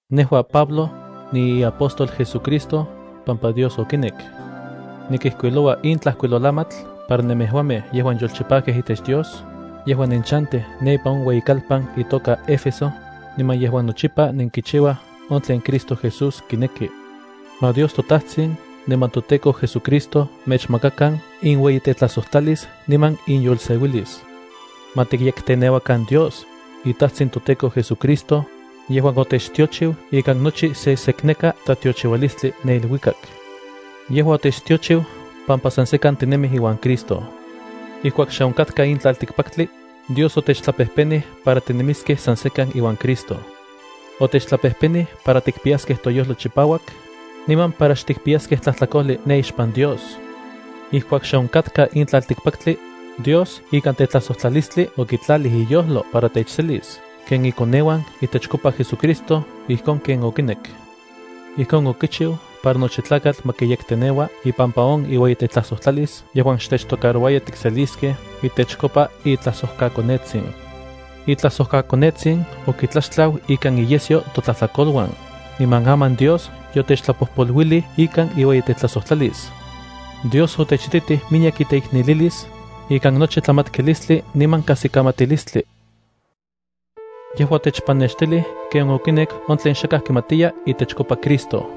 Nejua, Pablo, niiapóstol JesuCristo pampa Dios okinek. Nikijkuiloua in tlajkuilolamatl para nemejuamej yejuan yolchipajkej itech Dios, yejuan nenchantij ne ipan on ueyikalpan itoka Éfeso, niman yejuan nochipa nenkichiuaj on tlen Cristo Jesús kineki. Ma Dios toTajtsin niman toTEKO JesuCristo mechmakakan inueyitetlajsojtlalis niman inyolseuilis. Ma tikyekteneuakan Dios, iTajtsin toTEKO JesuCristo, yejuan otechtiochiu ikan nochi sesekneka tlatiochiualistli ne iluikak. Yejua otechtiochiu pampa san sekan tinemij iuan Cristo. Ijkuak xe onkatka in tlaltikpaktli, Dios otechtlapejpenij para tinemiskej san sekan iuan Cristo. Otechtlapejpenij para tikpiyaskej toyojlo chipauak, niman para xtikpiyaskej tlajtlakojli ne ixpan Dios. Ijkuak xe onkatka in tlaltikpaktli, Dios ikan tetlajsojtlalistli okitlalij iyojlo para techselis ken ikoneuan itechkopa JesuCristo ijkon ken okinek. Ijkon okichiu para nochi tlakatl ma kiyekteneua ipampa on iueyitetlajsojtlalis yejuan xtechtocarouaya tikseliskej itechkopa itlajsojkaKonetsin. ItlajsojkaKonetsin okitlaxtlau ikan iyesyo totlajtlakoluan, niman aman Dios yotechtlapojpoluilij ikan iueyitetlajsotlalis. Dios otechititij miyek iteiknelilis, ikan nochi tlamatkilistli niman kajsikamatilistli. Yejua otechpanextilij ken okinek on tlen xakaj kimatiya itechkopa Cristo.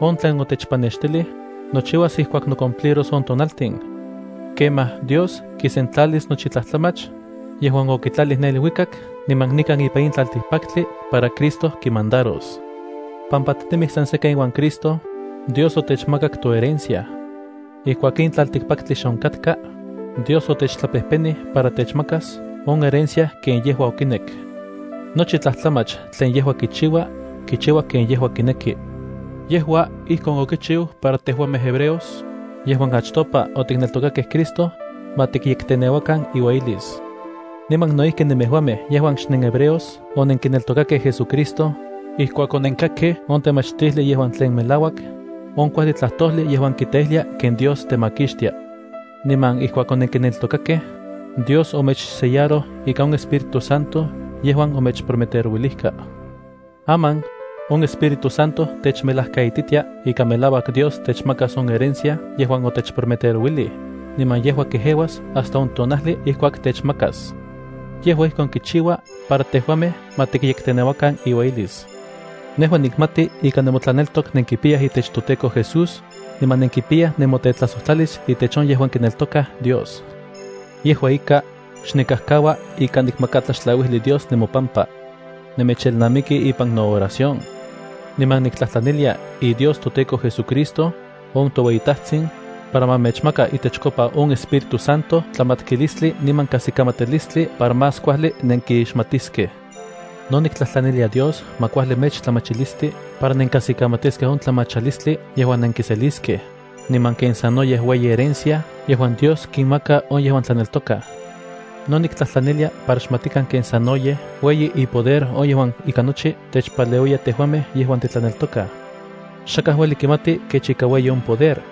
On tlen otechpanextilij, nochiuas ijkuak nocumpliros on tonaltin. Kemaj, Dios kisentlalis nochi tlajtlamach yejuan okitlalij ne iluikak niman nikan ipan in tlaltikpaktli para Cristo kimandaros. Pampa tinemij san sekan iuan Cristo, Dios otechmakak toherencia. Ijkuak in tlaltikpaktli xe onkatka, Dios otechtlapejpenij para techmakas on herencia ken yejua okinek. Nochi tlajtlamach tlen yejua kichiua, kichiua ken yejua kineki. Yejua ijkon okichiu para tejuamej hebreos, yejuan achtopa otikneltokakej Cristo, ma tikyekteneuakan iueyilis. Niman no ijki nemejuamej yejuan xnenhebreos onenkineltokakej JesuCristo, ijkuak onenkakkej on temachtijli yejuan tlen melauak, on kuajli tlajtojli yejuan kiteijlia ken Dios temakixtia. Niman ijkuak onenkineltokakej, Dios omechsellaroj ika on Espíritu Santo yejuan omechprometerouilijka. Aman, on Espíritu Santo techmelajkaititia ika melauak Dios techmakas on herencia yejuan otechprometerouilij, niman yejua kejeuas hasta on tonajli ijkuak techmakas. Yejua ijkon kichiua para tejuamej ma tikyekteneuakan iueyilis. Nejua nikmati ika nemotlaneltok nenkipiyaj itech toTEKO Jesús, niman nenkipiyaj nemotetlajsojtlalis itech on yejuan kineltokaj Dios. Yejua ika, xnikajkaua ika nikmaka tlaxtlauijli Dios nemopampa. Nemechelnamiki ipan nooración, niman niktlajtlanilia iDios toTEKO JesuCristo, on toueyiTajtsin, para ma mechmaka itechkopa on Espíritu Santo tlamatkilistli niman kajsikamatilistli para más kuajli nenkixmatiskej. No niktlajtlanilia Dios ma kuajli mechtlamachilisti para nenkajsikamatiskej on tlamachalistli yejuan nenkiseliskej, niman ken sanoyej ueyi herencia yejuan Dios kinmaka on yejuan tlaneltokaj. No niktlajtlanilia para xmatikan ken sanoyej ueyi ipoder on yejuan ika nochi techpaleuiya tejuamej yejuan titlaneltokaj. Xakaj ueli kimati kech ika ueyi on poder.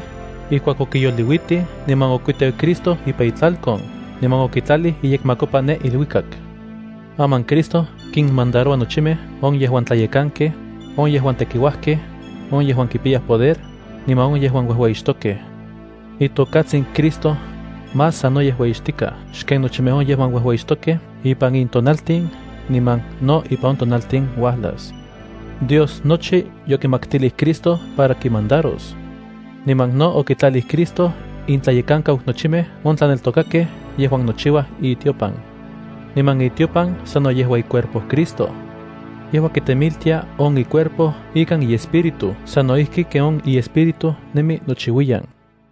ijkuak okiyoliuitij niman okuiteu Cristo ipan itlalkon, niman okitlalij iyekmakopa ne iluikak. Aman Cristo kinmandaroua nochimej on yejuan tlayekankej, on yejuan tekiuajkej, on yejuan kipiyaj poder, niman on yejuan uejueyixtokej. Itokatsin Cristo, más sanoyej ueyixtikaj xken nochimej on yejuan uejueyixtokej ipan in tonaltin niman no ipan on tonaltin uajlas. Dios nochi yokimaktilij Cristo para kimandaros. Niman no okitlalij Cristo intlayekankau nochimej on tlaneltokakej yejuan nochiuaj itiopan. Niman itiopan sano yejua icuerpo Cristo. Yejua kitemiltia on icuerpo ikan iEspíritu sano ijki ken on iEspíritu nemi nochiuiyan.